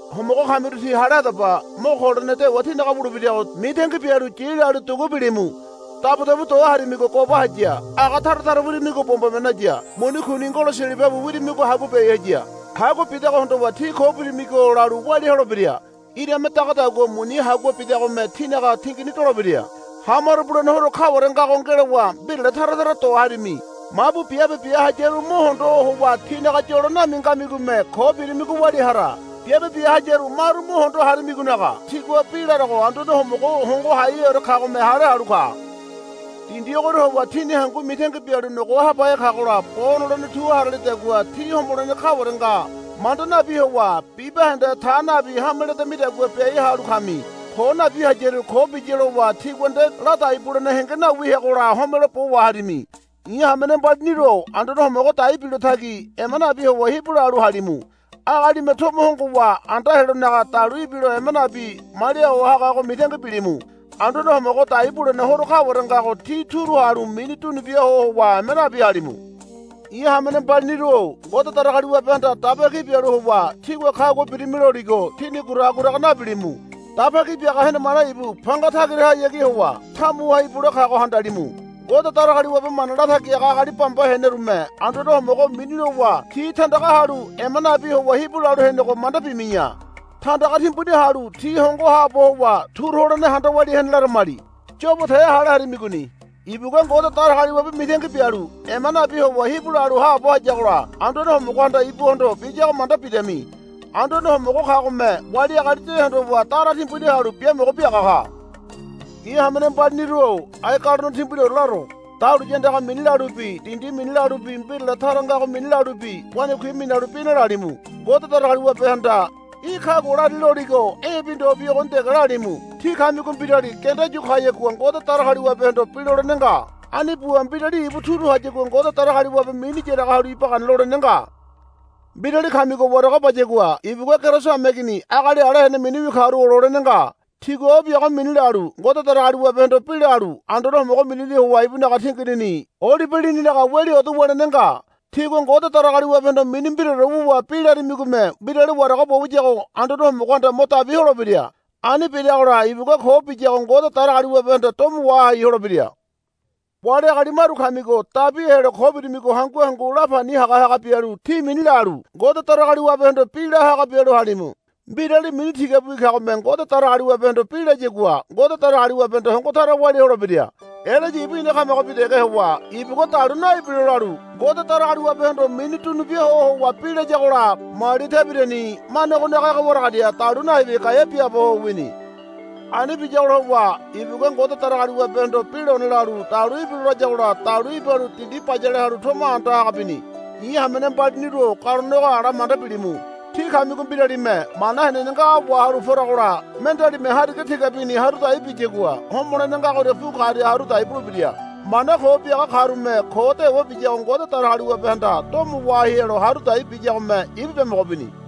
Homogo kamiru tí hale hadaba. Mo ko holene dewa tínaga wulebirago mitangi bialu yi lalu dugu bilimu. Dabudabu do harimigo goba haya. Aga tara tara wirimigo bombome naya. Muni kuni ngolo silibabi wirimigo hagua biai haya. Hagua bidago hondowa tí ko birimigo lalu walia holebira. Irame dagadagua muni hagua bidagome tínaga tingini dolebira. Hamaro bulene horo kaware ngago ngelowa mbirale tara tara do harimi. Mabu biabe bia hayaru mo hondo howa tinaga yolo nami ngamigome ko birimigo walia hara. Biabe bia hayaru maru mo hondo harimigonaga tigua bi larago Anduane Homogo Hongo Haiheore kagome hale halu ka. Dindi ogoria howa tíni hangu mitangi bialu nogo habahe kagola bo nolene tu haralidagua tí homolene kaware nga manda nabi howa bibahende ta nabi hame ledamidagua biai halu kami. Ko nabi hayaru, Ko biya, lowa tigua nde ladai bulene henge nawi heagola homelo bo waharimi. I̱ hamene mbaliniru-o Anduane Homogo dai bilo tagi ema nabi howa hibu lalu halimu. Agalime tomo hongowa anda helonaga dalu ibilo ema nabi malia ho hagago mitangi bilimu. Anduane Homogo dai bulene horo kaware ngago tí turu halu mini dunubia ho howa ema nabi halimu. I̱ hamene mbaliniru-o Ngode Datagaliwabehanda daba ki bialu howa, Tígua kagua birimi, loligo tíni guraga guraga nabilimu. Daba Ki Biaga henemane ibu panga tagirahayagi howa tamuha ibule kago handalimu. Ngode Datagaliwabe mana latagi haga agali bamba henerume Anduane Homogo mini lowa ti tandaga halu ema nabi howa hibu lalu henego manda bimi̱ya. Tandaga timbuni halu ti hongo haabo howa turu holene handa walia hene laramali. Yobo te hale harimigoni. Ibugua Ngode Datagaliwabe mitangi bialu ema nabi howa hibu lalu haabo hayagola Anduane Homogohanda ibuhondo biyago manda bidami. Anduane Homogo kagome wali agali de hondowa dara timbuni halu biamogo biaga ka. I̱ hamene mbaliniru-o ai galone timbuniore laro. Dahuliya andaga mini lalubi dindi mini lalubi mbirale tara ngago mini lalubi wanakui minalu bi nalalimu. Ngode Datagaliwabehanda, Í̠ kagua lari, loligo e̱bi ndobi ogoni dege lalimu. Tí kamigo mbirali genda yu kayagua Ngode Datagaliwabehondo bi lolene nga. Ani buwa mbirali ibu turu hayagua Ngode Datagaliwabe mini yaraga halu iba gana lolene nga. Mbirali kamigo warago bayagua ibugua Keriso hameigini agali ala hene miniwi karu ololene nga. Tigua o biago mini lalu Ngode Datagaliwabehondo bi lalu Anduane Homogo minini howa ibunaga tinginini olibe lininaga weli odo wulene nga. Tígua Ngode Datagaliwabehondo mini mbiraore wuwa bi larimigome mbirali warago bo wiyago Anduane Homogohanda mo dabi holebira. Ani biragola ibugua ko biyago Ngode Datagaliwabehanda domo wahai holebira. Wali agali maru kamigo dabi helo ko birimigo hangu hangu lapani hagahaga bialu ti mini lalu Ngode Datagaliwabehondo bi la haga bialu halimu. Mbirali mini tigabiwi kagome Ngode Datagaliwabehondo bi layagua Ngode Datagaliwabehanda hongo tara walia holebira. Elaya ibu ina kamagobi dege howa ibugua dalu naibilo lalu Ngode Datagaliwabehondo mini dunubia ho howa bi layagola mali tebirani manegonaga ege waragaria dalu naibi gaea biaabo ho wini. Ani biyagola howa ibugua Ngode Datagaliwabehondo bi lone lalu, Dalu ibila, layagola dalu ibalu dindi bayale halu tomo anda haga bini. I̱ hamene mbaliniru-o galone ogo ala manda bilimu. Tí kamigo mbiralime mana henene ngago wahalu poragola mendealime hariga tigabini haru dai biyagua homolene ngagoria pu karia haru dai bulebira. Mana ko biaga karume ko dewa biyago Ngode Datagaliwabehanda domo wahai helo haru dai biyagome ibu biamogo bini.